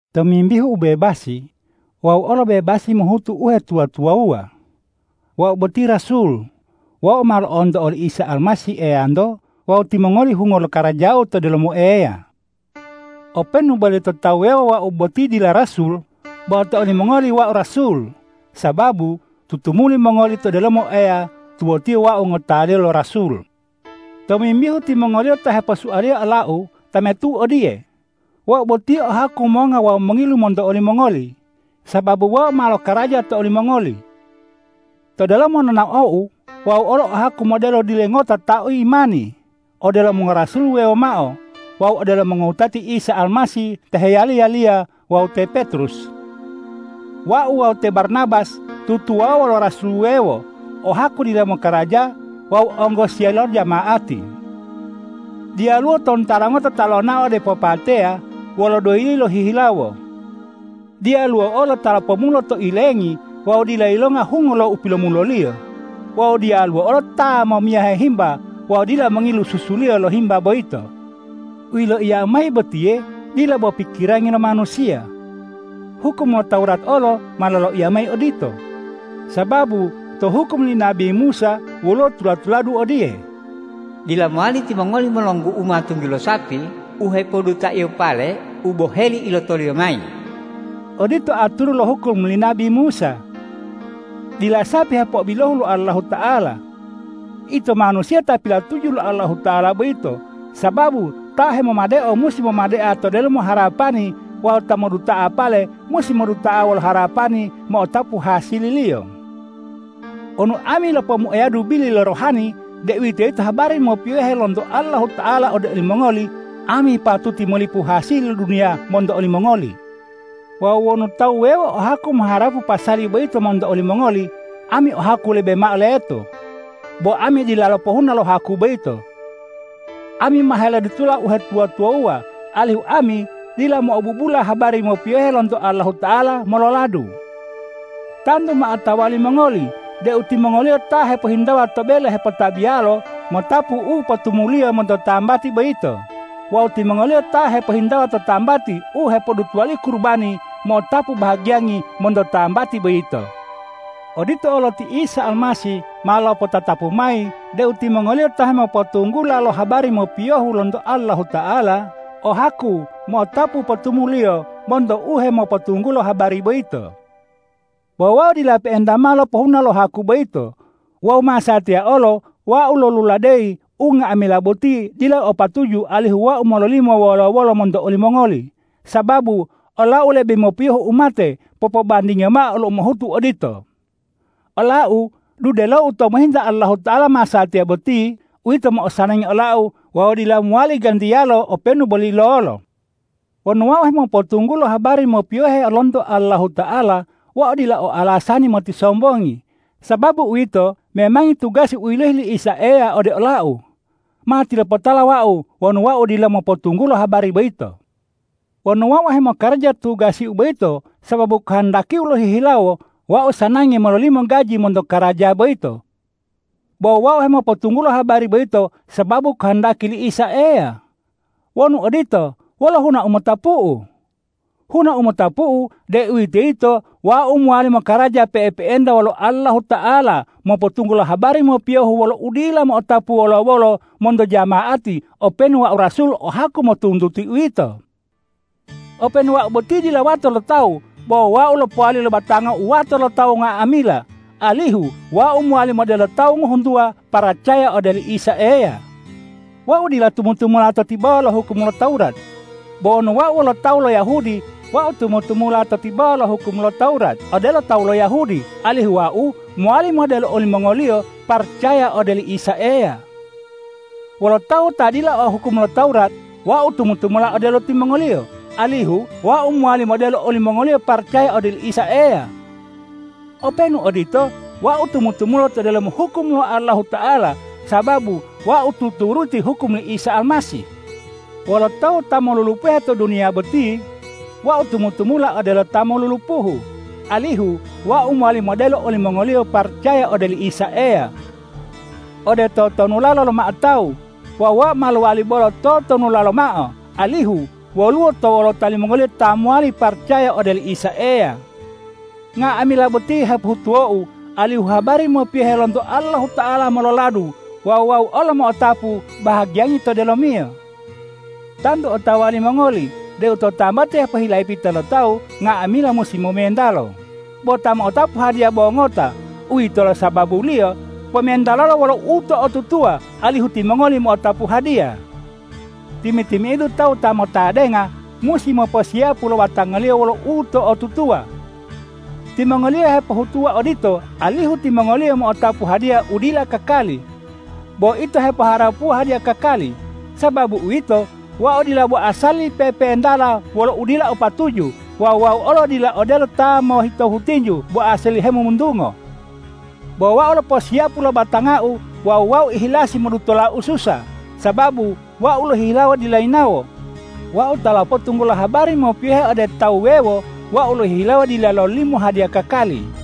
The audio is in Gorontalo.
Tomimbihu ubebasi, wau olo bebasi mohutu uhetuwa-tuwawuwa. Wau boti rasul, wau ma lo'onto oli Isa Almasih Eyanto wawu timongoli hungo lo karajau to delomo Eya. Openu boli to tawu wuwewo wau boti dila rasul, bo to olimongoli wau rasul, sababu tutumuli mongoli to delomo Eya tuwotiyo wau ngotaliyo lo rasul. Tomimbihu timongoliyo ta heposualiya olau tametu'u odiye: Wau boti o haku monga wawu mongilu monto olimongoli, sababu wau ma lokaraja to olimongoli. To delomo nonaou wau olo o haku modelo dile ngota ta o imani odelo mongorasul wuwewo mao wawu odelo mongowutati Isa Almasih ta heyali-yaliya wawu te Petrus. Wau wawu te Barnabas tutuwawuwa wolo rasul wuwewo o haku dila mokaraja wawu onggosiya lo jama'ati. Diyaluwo tontara ngota ta lonao ode popateya wolo doyiliyo lohihilawo. Diyaluwo olo ta lopomulo to ilengi wawu dila yilonga hungo lo u pilomuloliyo. Wawu diyaluwo olo ta momiyahe himba wawu dila mongilu susuliyo lo himba boyito. U yiloiyau mayi botiye dila bo pikirangi lo manusiya. Hukum lo Tawurat olo ma loloiya mayi odito. Sababu to hukum li nabi Musa woluwo tula-tuladu odiye,”Dila mowali timongoli molonggu'uma tunggilo sapi u hepodutaiyo pale u boheli ilotoliyo mayi!” Odito aturu to hukum li nabi Musa. Dila sapi u hepo'obilohu lo Allahuta'ala. Ito manusiya ta pilatuju lo Allahuta'ala boyito, sababu ta hemomadeo musi momadea to delomo harapani wawu ta moduduta'a pale musi moduta'a wolo harapani mo'otapu hasililiyo. Wonu ami lopomuayadu bili lo rohani, deuwitoyito habari mopiyohe lonto Allahuta'ala ode olimongoli, ami patuti molipu hasili lo duniya monto olimongoli. Wawu wonu tawu wuwewo o haku moharapu pasali boyito monto olimongoli, ami o haku lebe mao leto. Bo ami dila lopohuna lo haku boyito. Ami ma helodutola uhetuwa-tuwawuwa, alihu ami dila mo'obubula habari mopiyohe lonto Allahuta'ala mololadu. Tantu ma otawa limongoli deu timongoliyo ta hepohintawa to bele hepotabiyalo mo'otapu u potumuliyo monto tambati boyito wawu timongoliyo ta hepohintawa to tambati u hepodutuwaliyo kurubani mo'otapu bahagiyangi monto tambati boyito. Odito olo ti Isa Almasih ma lopotatapu mayi deu timongoliyo ta hepopotunggula lo habari mopiyohe lonto Allahuta'ala o haku mo'otapu u potumuliyo monto u hemopotunggulo habari boyito. Bo wau dila pe'enta mao lopohuna lo haku boyito. Wawu masatiya olo wau loluladeyi unga'amila boti dila o patuju alihu wau mololimo wolo-wolo monto olimongoli, sababu olau lebe mopiyohu umate popobandingiyo mao lo umohutu odito. Olau, dudelou tou mohinta Allahuta'ala masatiya boti, uwito u mo'osanangi olau wawu dila mowali gantiyalo openu boli lolo. Wonu wau hemopotunggulo habari mopiyohe lonto Allahuta'ala, wau dila o alasani motisombongi, sababu uwito memangi tugasi u yilohi li Isa Eya ode olau. Matilopotala wau wonu wau dila mopotunggulo habari boyito. Wonu wau hemokaraja tugasi boyito sababu kohondakiu lohihilawo, wau sanangi mololimo gaji monto karaja boyito. Bo wau hemopotunggulo habari boyito sababu kohondaki li Isa Eya. Wonu odito, wolo huna u motapu'u? Huna u motapu'u, deuwitoyito wau mowali mokaraja pe'epe'enta wolo Allahuta'ala mopotunggulo habari mopiyohu wolo udila mo'otapu wolo-wolo monto jama'ati openu wau rasul o haku motuntuti uwito. Openu wau boti dila wato lo tawu, bo wau ma lopowali lo batangau wato lo tawu nga'amila, alihu wau mowali modelo tawu ngohuntuwa paracaya ode oli Isa Eya. Wau dila tumu-tumula to tibawa lo hukum lo Tawurat. Bo wonu wau wolo tawu lo Yahudi, wau tumu-tumula to tibawa lo hukum lo Tawurat odelo tawu lo Yahudi, alihu wau mowali modelo olimongoliyo paracaya ode oli Isa Eya. Wolo tawu ta dila o hukum lo Tawurat, wau tumu-tumula odelo timongoliyo, alihu wau mowali modelo olimongoliyo paracaya ode oli Isa Eya. Openu odito, wau tumu-tumula to delomo hukum lo Allahuta'ala sababu wau tuturuti hukum li Isa Almasih. Wolo tawu ta molulupuhe to duniya boti, wau tumu-tumula odelo ta molulupuhu, alihu wau mowali modelo olimongoliyo paracaya ode oli Isa Eya. Ode totonulala lomao tawu, wau ma lowali bolo totonulala lomao, alihu woluwo to wolota limongoliyo ta mowali paracaya ode oli Isa Eya. Nga'amila boti hepohutuwou, alihu habari mopiyohe lonto Allahuta'ala mololadu wawu wau olo mo'otapu bahagiyangi to delomiyo. Tantu otawa limongoli deu to tambati hepohilapita lo tawu nga'amila musi momentalo, bo ta mo'otapu hadiya bo ngota. Uwitolo sababuliyo pomentalolo wolo uto'otutuwa, alihu timongoli mo'otapu hadiya! Timi-timi'idu tawu ta motadenga musi moposiyapu lo batangaliyo wolo uto'otutuwa. Timongoliyo hepohutuwa odito, alihu timongoliyo mo'otapu hadiya u dila kakali. Bo ito hepoharapuwa hadiya kakali. Sababu uwito, wau dila bo asali pepentala wolo udila o patuju wawu wau olo dila odelo ta hemoyitohu tinju bo asali hemomuntungo. Bo wau loposiyapu lo batangau wawu wau ihilasi modutola ususa, sababu wau lohihilawo dila yinawo, wau ta lopotunggulo habari mopiyohu ode tawu wuwewo, wau lohihilawo dila lololimo hadiya kakali.